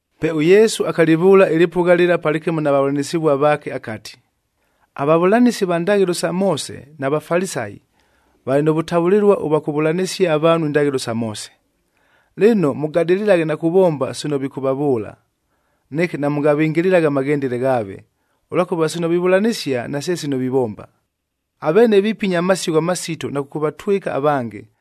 Pe ʉYesu akalɨvʉʉla ɨlɨpʉgha lɨla palɨkɨmo na vavʉlanɨsɨvua vaake akati, “AVavʉlanɨsi va ndaghɨlo sa Moose na Vafalisayi valɨ nʉ vʉtavʉlɨlua ʉvwa kʉvavʉlanɨsia avaanhu indaghɨlo sa Moose. Lɨno, mʉgadɨlɨlaghe na kuvomba sino vikʉvavʉʉla. Neke namʉngavɨngɨlɨlaghe amaghendele ghaave, ʉlwakʉva sino vivʉlanɨsia nase sino vivomba. Aveene vipinya amasigho amasitoa na kʉkʉvatwɨka avange,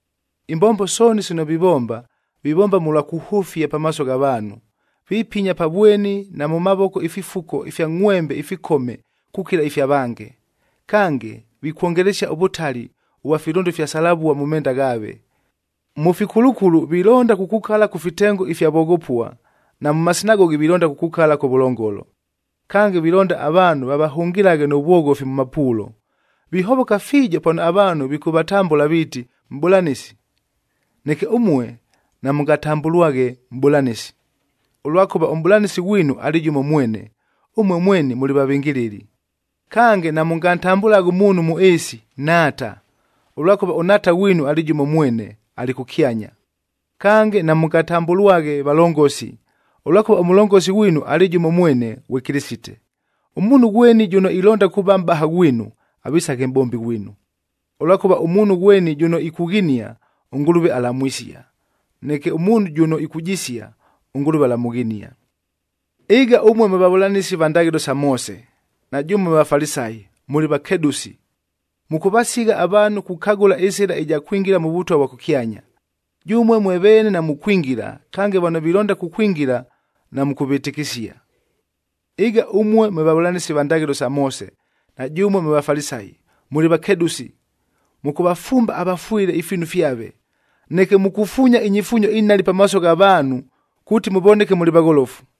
“Imbombo sooni sino vivomba, vivomba mʉlwa kuhʉfia pamaaso gha vaanhu. Vipinya pa vweni na mʉ mavoko ififuko ifya ngʼhwembec ifikome kukila ifya vange. Kange, vikwongelesia ʉvʉtali ʉvwa filʉndo ifya salavuad mʉ menda ghaave. Mʉ fikulukulu vilonda kukukala kʉ fitengo ifya voghopua, na mʉ masinagogi vilonda kukukala kʉvʉlongolo. Kange, vilonda avaanhu vavahʉngɨlaghe nʉ vwoghofi mʉ mapuulo. Vihovoka fiijo pano avaanhu vikʉvatambʉla viiti, ‘Mʼbʉlanɨsi.’ “Neke ʉmue namʉngatambʉlwaghe, ‘Mʼbʉlanɨsi,’ ʉlwakʉva ʉMʼbʉlanɨsi ghwinu alɨ jʉmo mwene, ʉmue mweni mʉlɨ vavɨngɨlɨli. Kange, namʉngantambʉlaghe ʉmuunhu mʉ ɨɨsi, ‘Nhaata,’ ʉlwakʉva ʉNhaata ghwinu alɨ jʉmo mwene, alɨ kʉkyanya. Kange, namʉngatambʉlwaghe, ‘Valongosi,’ ʉlwakʉva ʉMʉlongosi ghwinu alɨ jʉmo mwene, ghwe Kɨlɨsite. Ʉmuunhu ghweni jʉno ilonda kuuva mʼbaha ghwinu, avisaghe mʼbombi ghwinu. Ʉlwakʉva ʉmuunhu ghweni jʉno ikughinia, ʉNgʉlʉve alamwisia. Neke ʉmuunhu jʉno ikujisia, ʉNgʉlʉve alamʉghinia. “Ɨga ʉmue mwe vavʉlanɨsi va ndaghɨlo sa Moose, na jʉmue mwe Vafalisayi, mʉlɨ vakedʉsi! Mʉkʉvasigha avaanhu kukagʉla ɨsɨla ɨja kwingila mʉ Vʉtwa vwa kʉkyanya. Jʉmue mwe veene namukwingila, kange vano vilonda kukwingila, namʉkʉvɨtɨkɨsia. “Ɨga ʉmue mwe vavʉlanɨsi va ndaghɨlo sa Moose na jʉmue mwe Vafalisayi, mʉlɨ vakedʉsi! Mʉkʉvafumba avafwɨle ifiinu fyave, neke mukufuunya inyifuunyo inhali pamaaso gha vaanhu kuuti mʉvoneke mʉlɨ vagholofu!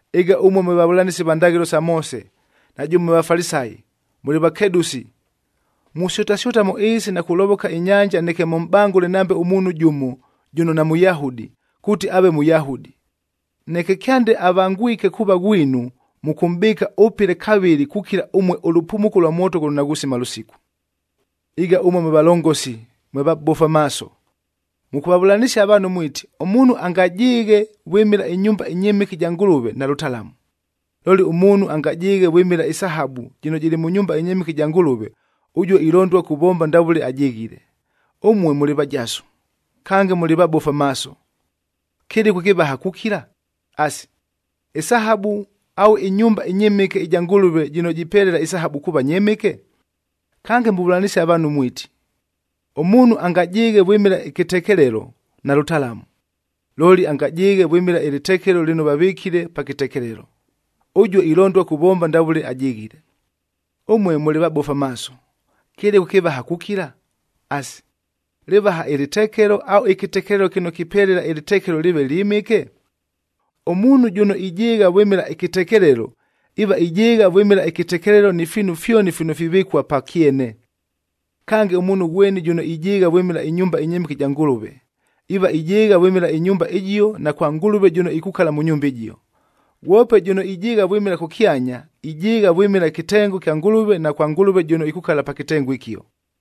“Ɨga ʉmue mwe vavʉlanɨsi va ndaghɨlo isa Moose na jʉmue mwe Vafalisayi, mʉlɨ vakedʉsi! Musyʉtasyʉta mʉ ɨɨsi na kulovoka inyanja neke mʉmʼbangʉle nambe ʉmuunhu jʉmo jʉno naMʉyahudi, kuuti aave Mʉyahudi. Neke kyande avangwike kuuva ghwinu, mʉkʉmʼbɨɨka ʉpɨle kavɨlɨ kukila ʉmue ʉlʉpumuko ʉlwa mwoto ghʉno naghusima lʉsiku. “Ɨga ʉmue mwe valongosi mwe vabofu amaaso! Mʉkʉvavʉlanɨsia avaanhu mwiti, ‘Ʉmuunhu angajɨɨghe vwɨmɨla ɨnyumba ɨnyɨmɨke ɨja Ngʉlʉve, nalʉtalamu. Looli ʉmuunhu angajɨɨghe vwɨmɨla ɨsahabu jɨno jɨlɨ mʉ nyumba ɨnyɨmɨke ɨja Ngʉlʉve, ʉjuo ilondua kuvomba ndavʉle ajɨghile.’ Ʉmue mʉlɨ vajasu, kange mʉlɨ vabofu amaaso! Kɨlɨku ɨkɨvaha kukila? Asi, isahabu au ɨnyumba ɨnyɨmɨke ɨja Ngʉlʉve jɨno jipelela isahabu kuuva nyɨmɨke? Kange muvʉlanɨsia avaanhu mwiti, ‘Ʉmuunhu angajɨɨghe vwɨmɨla ɨkɨtekelelo, nalʉtalamu. Looli angajɨɨghe vwɨmɨla ɨlɨtekelo lɨno vavɨkile pa kɨtekelelo, ʉjuo ilondua kuvomba ndavʉle ajɨghile.’ Ʉmue mʉlɨ vabofu amaaso! Kɨlɨku ɨkɨvaha kukila? Asi, lɨvaha ɨlɨtekelo au ɨkɨtekelelo kɨno kipelela ɨlɨtekelo lɨɨve lyɨmɨke? Ʉmuunhu jʉno ijɨɨgha vwɨmɨla ɨkɨtekelelo, iiva ijɨɨgha vwɨmɨla ɨkɨtekelelo ni fiinu fyoni fino fivɨkua pa kyene. Kange, ʉmuunhu ghweni jʉno ijɨɨgha vwɨmɨla ɨnyumba ɨnyɨmɨke ɨja Ngʉlʉve, iiva ijɨɨgha vwɨmɨla ɨnyumba ɨjio na kwa Ngʉlʉve jʉno ikukala mʉ nyumba ɨjio. Ghwope jʉno ijɨɨgha vwɨmɨla kʉkyanya, ijɨɨgha vwɨmɨla ɨkɨtengo kya Ngʉlʉve na kwa Ngʉlʉve jʉno ikukala pa kɨtengo ɨkio.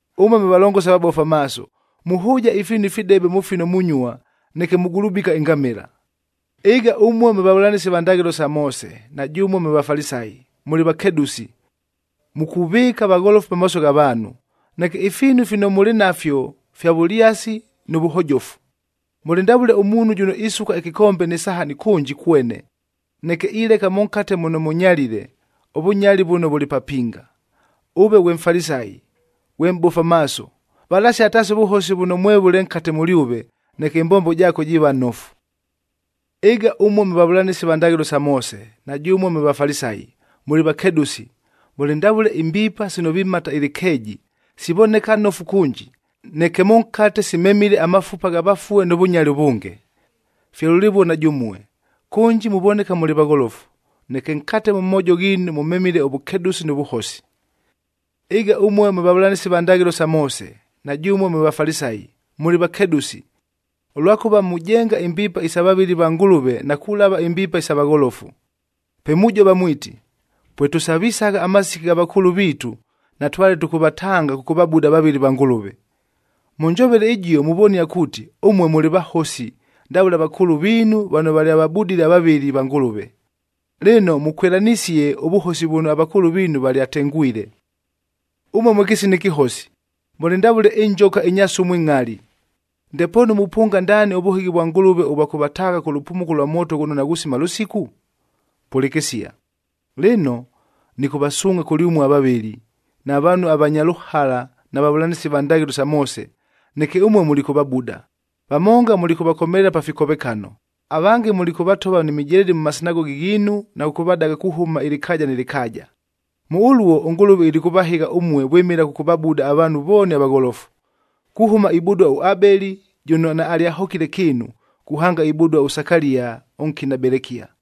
Ʉmue mwe valongosi vabofu amaaso! Muhʉʉja ifiinu ifidebe mʉ fino munyua, neke mugulubika ingamɨla! “Ɨga ʉmue mwe vavʉlanɨsi va ndaghɨlo sa Moose, na jʉmue mwe Vafalisayi, mʉlɨ vakedʉsi! Mukuvɨɨka vagholofu pamaaso gha vaanhu, neke ifiinu fino mʉlɨ nafyo fya vʉlyasi nʉ vʉhojofu. Mʉlɨ ndavʉle ʉmuunhu jʉno isuka ɨkɨkombe nɨ sahani kʉnji kwene, neke ileka mʉnkate muno mʉnyalile, ʉvʉnyali vʉno vʉlɨ papinga. Ʉve ghwe Mfalisayi, ghwe mʼbofu amaaso! Valasia taasi ʉvʉhosi vʉno mwevʉle nkate mʉlyʉve, neke ɨmbombo jaako jiiva nofu. “Ɨga ʉmue mwe vavʉlanɨsi va ndaghɨlo sa Moose, na jʉmue mwe Vafalisayi, mʉlɨ vakedʉsi! Mʉlɨ ndavʉle imbiipa sino vimata ɨlɨkeeji, sivoneka nofu kʉnji, neke mʉnkate simemile amafupa gha vafue nʉ vʉnyali ʉvʉnge. Fye lʉlɨvuo na jʉmue, kʉnji muvoneka mʉlɨ vagholofu, neke nkate mʉ moojo ghiinu mʉmemile ʉvʉkedʉsi nʉ vʉhosi. “Ɨga ʉmue mwe vavʉlanɨsi va ndaghɨlo sa Moose, na jʉmue mwe Vafalisayi, mʉlɨ vakedʉsi! Ʉlwakʉva mujenga imbiipa isa vavɨli va Ngʉlʉve na kulava imbiipa isa vagholofu. Pe mujova mwiti, ‘Pwetʉsavisagha amasiki gha vakʉʉlʉ viitu, natwale tʉkʉvatanga kʉkʉvabuda avavɨli va Ngʉlʉve.’ Mʉ njovele ɨjio muvonia kuuti, ʉmue mʉlɨ vahosi ndavʉle avakʉʉlʉ viinu vano valyavabudile avavɨli va Ngʉlʉve! Lɨno, mʉkwɨlanɨsie ʉvʉhosi vʉno avakʉʉlʉ viinu valyatengwile! “Ʉmue mwe kɨsina ɨkɨhosi! Mʉlɨ ndavʉle injoka inya sumu ɨngʼhali! Ndepoonu mupʉnga ndaani ʉvʉhɨghi vwa Ngʉlʉve ʉvwa kʉvataagha kʉ lʉpumuko lwa mwoto ghʉno naghusima lʉsiku? Pʉlɨkɨsia! Lɨno, nɨkʉvasuungʼha kʉlyʉmue avavɨli, na vaanhu avanya lʉhala na vavʉlanɨsi va ndaghɨlo sa Moose, neke ʉmue mulikʉvabuda, vamonga mulikʉvakomelela pa fikovekano, avange mulikʉvatova ni mijeledi mʉ masinagogi ghiinu na kʉkʉvadaga kuhʉma ɨlɨkaaja nɨ lɨkaaja. Mʉ ʉluo ʉNgʉlʉve ilikʉvahɨgha ʉmue vwɨmɨla kʉkʉvabuda avaanhu vooni avagholofu, kuhʉma ibudua ʉAbeli jʉno naalyahokile kɨɨnu, kuhanga ibudua ʉSakalia ʉnkina Belekia,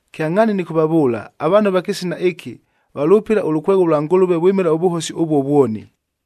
Kyangʼhaani nɨkʉvavʉʉla, avaanhu ava kɨsina ɨkɨ valʉpɨla ʉlʉkwegho lwa Ngʉlʉve vwɨmɨla ʉvʉhosi ʉvuo vwoni.”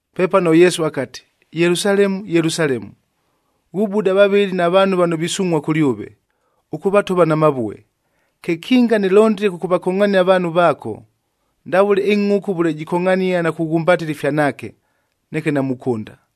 Pepano ʉYesu akati, “Yelusalemu, Yelusalemu! Ghubuda avavɨli na vaanhu vano visungʼhua kʉlyʉve, ʉkʉvatova na mavue. Kekinga nɨlondile kʉkʉvakongʼhania avaanhu vaako, ndavʉle ɨngʼhʉkʉ vʉle jikongʼhania na kughumbatɨla ifyanaake, neke namukʉnda!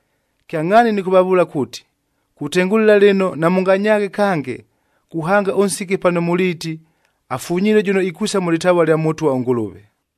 Kyangʼhaani nɨkʉvavʉʉla kuuti, kutengʉlɨla lɨno namʉnganyaaghe kange, kuhanga ʉnsiki pano muliiti, ‘Afunyilue jʉno ikwisa mʉ lɨtavua lya Mʉtwa ʉNgʉlʉve!’h”